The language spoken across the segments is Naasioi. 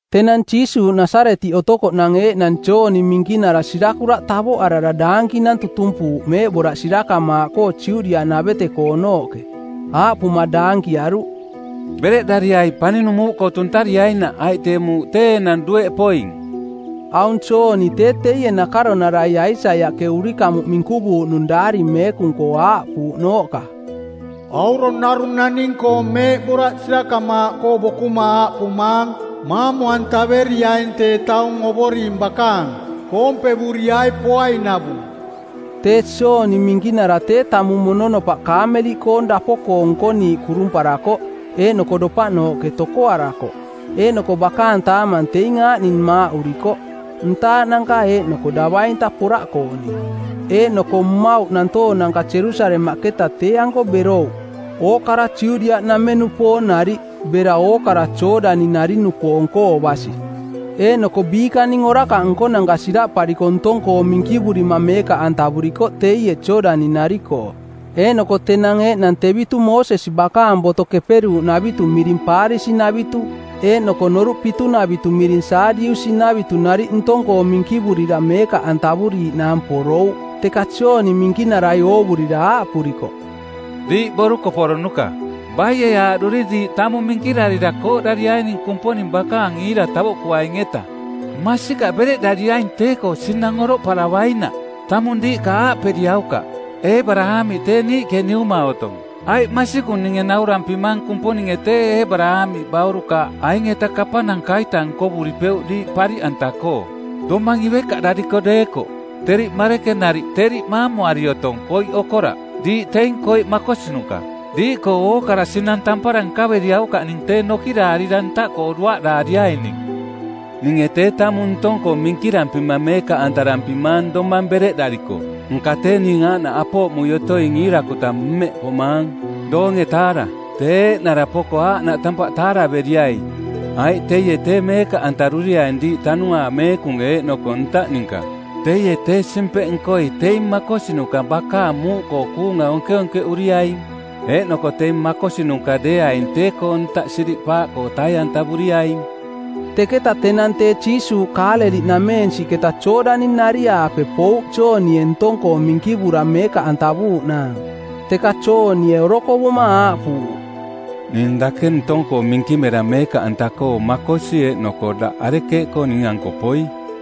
Tenang Jiisuuꞌ Nasaretiꞌ otokoꞌnang eeꞌnang Jooni Minkinara sirakuraꞌ tavoꞌarara daankinang tutumpuuꞌ meeꞌboraꞌ sirakamaaꞌkoo Judiaꞌnavete-koonooꞌke. Aaꞌpuma daankiaruꞌ, “Bereꞌdariai paninung muuꞌkoo tuntariainaꞌ, aiꞌ tee muuꞌ tee enang dueꞌ poing.” Aung Jooni tee teie nakaronara Aisaiaꞌke urikamuꞌ minkuvuuꞌnung Daari Meekung-koo aaꞌpuuꞌnooꞌka, “Aurong narung naning-koong meeꞌboraꞌ sirakamaaꞌkoo bokuma aaꞌpumaang, ‘Maamu-antaveriaing tee taung Ovoring bakaang. Koompevuriai poainavung.’” Tee Jooni Minkinara tee tamung mononopaꞌ kaameliꞌkoong dapo-koo nkoniiꞌ kurumparakoꞌ, eeꞌnoko dopaꞌnooꞌke tokoarakoꞌ. Eeꞌnoko bakaang taamang teing aaꞌning maaꞌurikoꞌ: ntaaꞌnanka eeꞌnoko davainta poraꞌkooning. Eeꞌnoko mmauꞌ nantoonanka Jerusalemaꞌketa tee-anko berouꞌ, ookara Judiaꞌnameng-nupoong nariꞌ, bera ookara Jooꞌdani-nari-nupoong-koo basi. Eeꞌnoko biikaning orakaꞌ nkonanka siraꞌpariko ntong-koo minkivurima meekaꞌantavurikoꞌ teie Jooꞌdani-nari-koo. Eeꞌnoko tenang eeꞌnang tevitu Moosesi bakaang Boto Keperuuꞌnavitu miring Paarisi-navitu eeꞌnoko Noruꞌ Pitunavitu miring Saadiusi-navitu nariꞌ ntong-koo minkivurira meekaꞌantavuriiꞌnaang porouꞌ. Teka Jooni Minkinarai oovurira aaꞌpurikoꞌ, “Diiꞌ borukoporonuka, baie aaꞌduri diiꞌ tamung minkirarira kooꞌdariaining Kumponing bakaang iira tavoꞌkuaing-eta? Masikaꞌ bereꞌdariaing tee-koo sinang oroꞌparavainaꞌ. Tamung diiꞌka aaꞌperiaukaꞌ, ‘Eebaraamiꞌ tee niiꞌke niuma otong,’ aiꞌ masikung ninge naurampimang Kumponinge tee Eebaraamiꞌ baurukaaꞌ aing-eta kapananka-ita nkovuripeuꞌ diiꞌ pariꞌanta-koo, domang ivekaꞌdariko deekoꞌ. Teriꞌ marekenariꞌ teriꞌ maamuari otong koiꞌkoo okoraꞌ. Diiꞌ teing koiꞌ makosinuka. Diiꞌkoo ookara sinang tampara nkaveriaukaꞌning tee nokiraarira ntaꞌkoo duaꞌdaariaining. Ninge tee tamung ntong-koo minkirampima meekaꞌantarampimaang domang bereꞌdariko, nka tee ning aaꞌnaꞌ apooꞌmui otoing iirakuta mmeꞌ pomaang, doonge-taara˜. Tee eeꞌnara poko aaꞌnaꞌ tampaꞌ taaraveriai, aiꞌ teie tee meekaꞌantaruriaing diiꞌ Tanuaang Meekung eeꞌnoko ntaꞌ ninka. Teie, tee simpeꞌnkoi˜ teing makosinuka bakaang muuꞌkoo kuunga onkeonkeꞌuriaing, eeꞌnoko teing makosinuka deeaing tee-koo ntaꞌkoo siriꞌpaaꞌkoo tai-antavuriaing.” Teketa tenang tee Jiisuuꞌ Kaaleliꞌnameensiꞌketa Jooꞌdani-nari-aape pouꞌ Joonie ntong-koo minkivura meekaꞌantavuuꞌnaang. Teka Joonie orokovuma aaꞌpuuꞌ, “Ning dake ntong-koo minkimera meekaꞌanta-koo makosi eeꞌnoko daꞌ arekeeꞌkoo ning-anko poi?”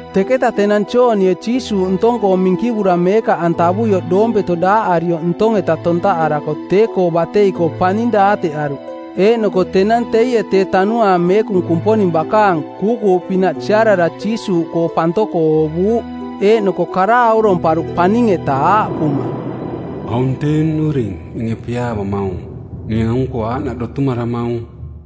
Teketa tenang Joonie Jiisuuꞌ ntong-koo minkivura meekaꞌantavuioꞌ doompeto daaꞌarioꞌ ntong-eta tontaꞌarako tee-koo batei-koo paning daateꞌaruꞌ eeꞌnoko tenang teie tee Tanuaang Meekung Kumponing bakaang, kuukuuꞌpinaꞌ siarara Jiisuuꞌkoo pantoko oovuuꞌ. Eeꞌnoko kara auromparuꞌ paning-eta aaꞌpuma, “Aung tee nnuring ninge piaavamaung. Ning aung-koo aaꞌnaꞌ dotumaramaung.”